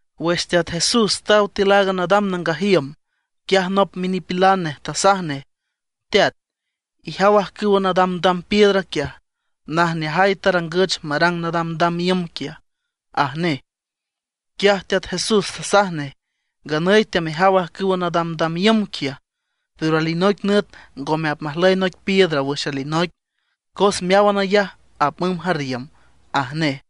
Wüx Teat Jesús taw tiül aaga nadam nangaj iüm, quiaj nop minipilan nej tasaj nej: ―¡Teat, ijaw ajcüwa nadamdam piedra quiaj! ¡Najneajay tarangüch marang nadamdam iüm quiaj! ―aj nej. Quiaj Teat Jesús tasaj nej: ―Nganüy teamejaw ajcüwa nadamdam iüm quiaj, pero alinoic nüt ngome apmajlüy noic piedra wüx alinoic, cos meáwan ayaj apmümb jarriüm ―aj nej.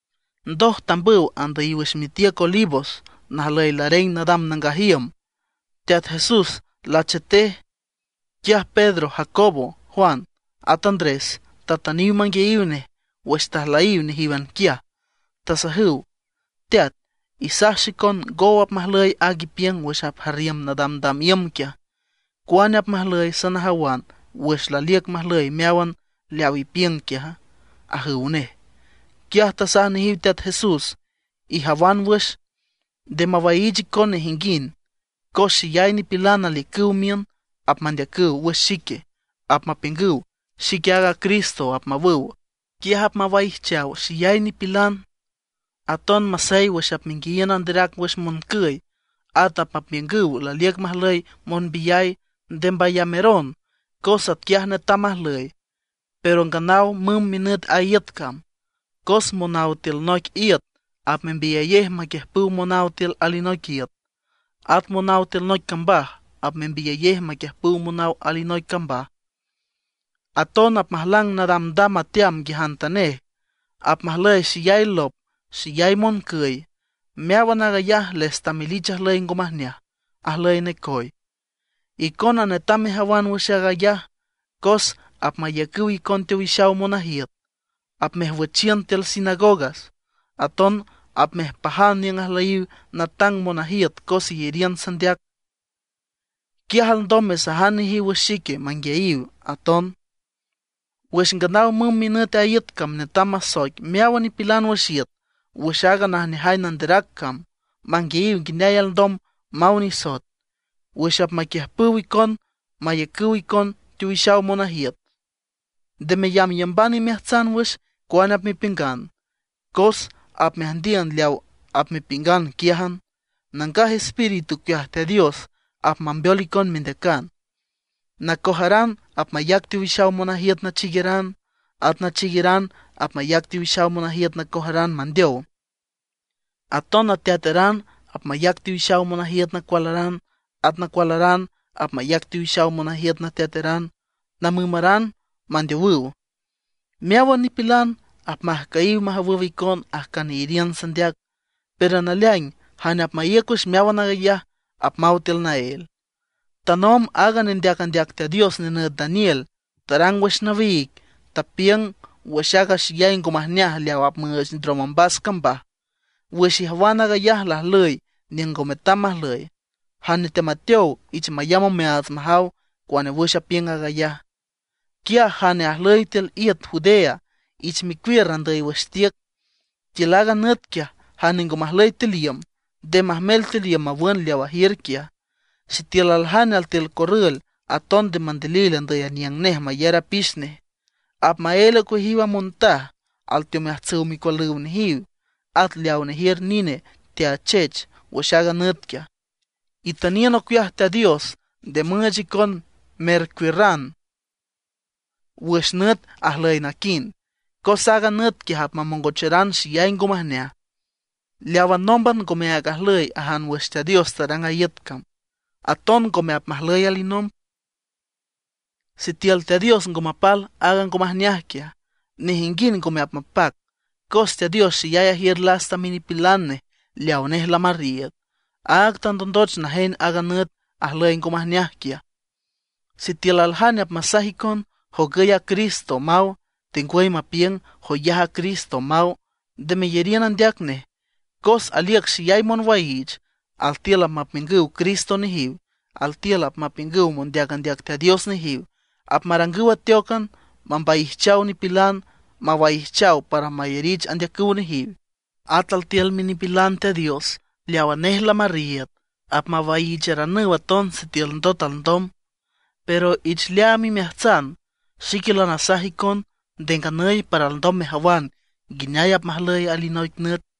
Ndoj tambüw andüyiw wüx mitiüc Olivos najlüy lareng nadam nangaj iüm. Teat Jesús lachetej; quiaj Pedro, Jacobo, Juan, at Andrés tatüniw manguiayiw nej wüx tajlüyiw nejíwan quiaj, tasajüw: ―Teat, isaj xicon ngow apmajlüy aag ipiüng wüx apjarriüm nadamdam iüm quiaj. ¿Cuane apmajlüy sanajawan wüx laliüc majlüy meáwan leawa ipiüng quiaja? ―ajüw nej. Quiaj tasaj nejiw Teat Jesús: ―Ijawan wüx, nde mawaiich icon nejinguind. Cos xeyay nipilan aliücüw miün, apmandeacüw wüx xique, apmapiüngüw: “Xique aaga Cristo”, apmawüw. Quiaj apmawaijchaw xeyay nipilan. ’Aton masey wüx apmenguiayiün anderac wüx moncüy, at apmapiüngüw laliüc majlüy monbiyay, nde mbayameron cos atquiaj netam majlüy, pero nganaw mümb minüt a iüt cam. Cos monaw tiül noic iüt apmembiyayej maquiüjpüw monaw tiül alinoic iüt. At monaw tiül noic cambaj apmembiyayej maquiiüjpüw monaw alinoic cambaj. Aton apmajlang nadamdam ateam nguiajantanej. Apmajlüy xeyay lop, xeyay moncüy. Meáwan aaga ayaj les tamelich ajlüy ngo majneaj, ajlüy necoy. ’Icona netam mejawan wüx aag ayaj, cos apmayacüw icon teowixaw monajiüt, apmejwüchiün tiül sinagogas. Aton apmejpajan niüng ajlüyiw natang monajiüt cos iyariün sandeac. Quiaj alndom mesajan nejiw wüx xique manguiayiw aton. Wüx nganaw mümb minüt a iüt cam netam masoic meáwan nipilan wüx iüt wüx aaga najneajay nanderac cam, manguiayiw nguineay alndom maw nisoet. Wüx apmaquiüjpüw icon mayacüw icon teowixaw monajiüt, nde meyamyamban imeajtsan wüx cuane apmepiüngan, cos apmeajndiün leaw apmepiüngan quiájan. Nangaj Espíritu ocueaj Teat Dios apmambeol icon mendeacan. Nacojaran apmayac teowixaw monajiüt nachiigueran; at nachiigueran apmayac teowixaw monajiüt nacojaran mandeow. Aton nateataran apmayac teowixaw monajiüt nacualaran, at nacualaran apmayac teowixaw monajiüt nateataran, namümaran, mandeowüw. Meáwan nipilan apmajcüyiw majawüw icon ajcan iyariün sandeac. Pero naleaing jane apmaíüc wüx meáwan aag ayaj, apmaw tiül naél. ’Tanomb aaga nendeac andeac Teat Dios nenüt Daniel tarang wüx nawiig, tapiüng wüx aaga xeyay ngo majneaj leaw apmüüch ndrom ombas cambaj. Wüx ijawan aag ayaj lajlüy niüng ngo metam majlüy (jane teamateow ich mayamb omeaats majaw cuane wüx apiüng aag ayaj), quiaj jane ajlüy tiül iüt Judea ich mecuiür andüy wüx tiüc. Tiül aaga nüt quiaj jane ngo majlüy tiül iüm, nde majmel tiül iüm mawün leaw ajiür quiaj. Sitiül aljane altiül corrül, aton nde mandilil andüy aniüng nej mayar apix nej. ¡Apmaél ocueajiw a montaj alteomeajtsüw micualüw nejiw, at leawa nejiür nine teachech wüx aaga nüt quiaj! Itüniün ocueaj Teat Dios nde müüch icon mercuiürran wüx nüt ajlüy naquind, Cos aaga nüt quiaj apmamongocharan xeyay ngo majneaj, leawa nómban ngomeaag ajlüy ajan wüx Teat Dios tarang a iüt cam, aton ngome apmajlüy alinomb. Sitiül Teat Dios ngo mapal aaga ngo majneaj quiaj, nejinguind ngome apmapac. Cos Teat Dios xeyay ajiür lasta minipilan nej leaw nej lamarriiüd, áag tandondoch najen aaga nüt ajlüy ngo majneaj quiaj. ’Sitiül aljane apmasaj icon: “Jogüy a Cristo”, maw; tengwüy mapiüng: “Joyaj a Cristo”, maw, nde meyariün andeac nej. Cos aliücüw xeyay monwaiich; altiül apmapiüngüw cristo nejiw. Altiül apmapiüngüw mondeac andeac Teat Dios nejiw; apmarangüw ateócan mambaijchaw nipilan, mawaijchaw para mayarich andeacüw nejiw. At altiül minipilan Teat Dios leawa nej lamarriiüd apmawaiicharanüw aton sitiül ndot alndom. Pero ich leaam imeajtsan, xique lanasaj icon nde nganüy para alndom mejawan nguineay apmajlüy alinoic nüt.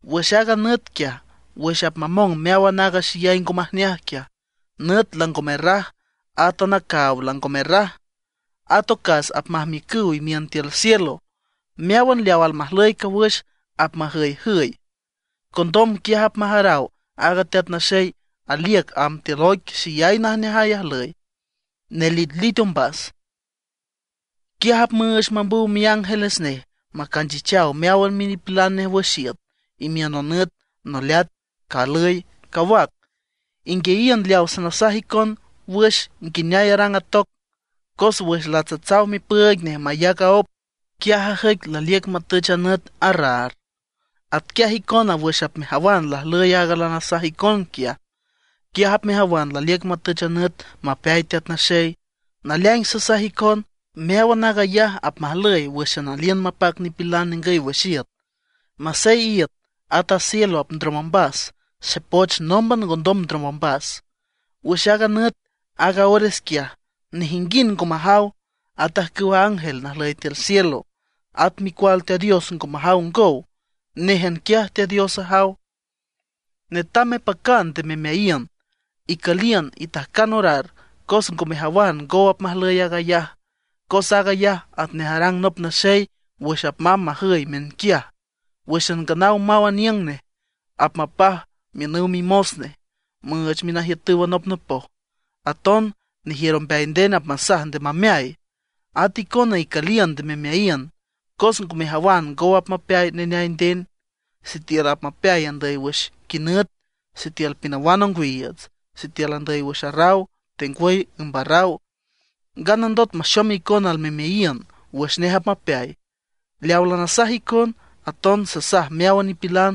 ’Wüx aaga nüt quiaj, wüx apmamong meáwan aaga xeyay ngo majneaj quiaj, nüt lango merraj átan a caaw lango merraj. At ocas apmajmiücüw imiün tiül cielo, meáwan leaw almajlüy cawüx apmajüyjüy. Condom quiaj apmajaraw aaga Teat Naxey aliüc amb tiül oic xeyay najneajay ajlüy, nelitlit ombas. Quiaj apmüüch mambüw miángeles nej macanchichaw meáwan minipilan nej wüx iüt, imiün nonüt, noleat, calüy, cawac. ’Inguiayiün leaw sanasaj icon wüx nguineay arang a toc: Cos wüx latsatsaw mipüüig nej mayac aóp, quiaj ajüic laliüc matüch a nüt arraar. Atquiaj icona wüx apmejawan lajlüy aaga lanasaj icon quiaj, quiaj apmejawan laliüc matüch a nüt mapeay Teat Naxey. Naleaing sasaj icon, meáwan aag ayaj apmajlüy wǘxan aliün mapac nipilan ningüy wüx iüt. Masey iüt, at a cielo apndrom ombas, xepoch nómban ngondom ndrom ombas. ’Wüx aaga nüt, aaga ores quiaj, nejinguind ngo majaw, at ajcüwa ángel najlüy tiül cielo, at Micual Teat Dios ngo majaw ngow. Néjan quiaj Teat Dios ajaw. ’Netam mepacan nde memeayiün, icüliün, itajcan orar cos ngo mejawan ngow apmajlüy aag ayaj. Cos aag ayaj atnej arang nop naxey wüx amb majüy miünquiaj. Wǘxan nganaw maw aniüng nej apmapaj miünüw mimos nej, müüch minajiütüw anopnopoj. Aton nejiür ombeay nden apmasaj nde mameay. At icona, icüliün, nde memeayiün, cos ngo mejawan ngow apmapeay neneay nden; sitiül apmapeay andüy wüx quinüt, sitiül pinawan ongwiiüts, sitiül andüy wüx arraw, tengwüy ümb arraw; nganandot maxom icon almemeayiün wüx nej apmapeay. Leaw lanasaj icon, aton sasaj meáwan nipilan: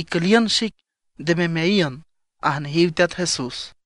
Icüliün xic, nde memeayiün ―aj nejiw Teat Jesús.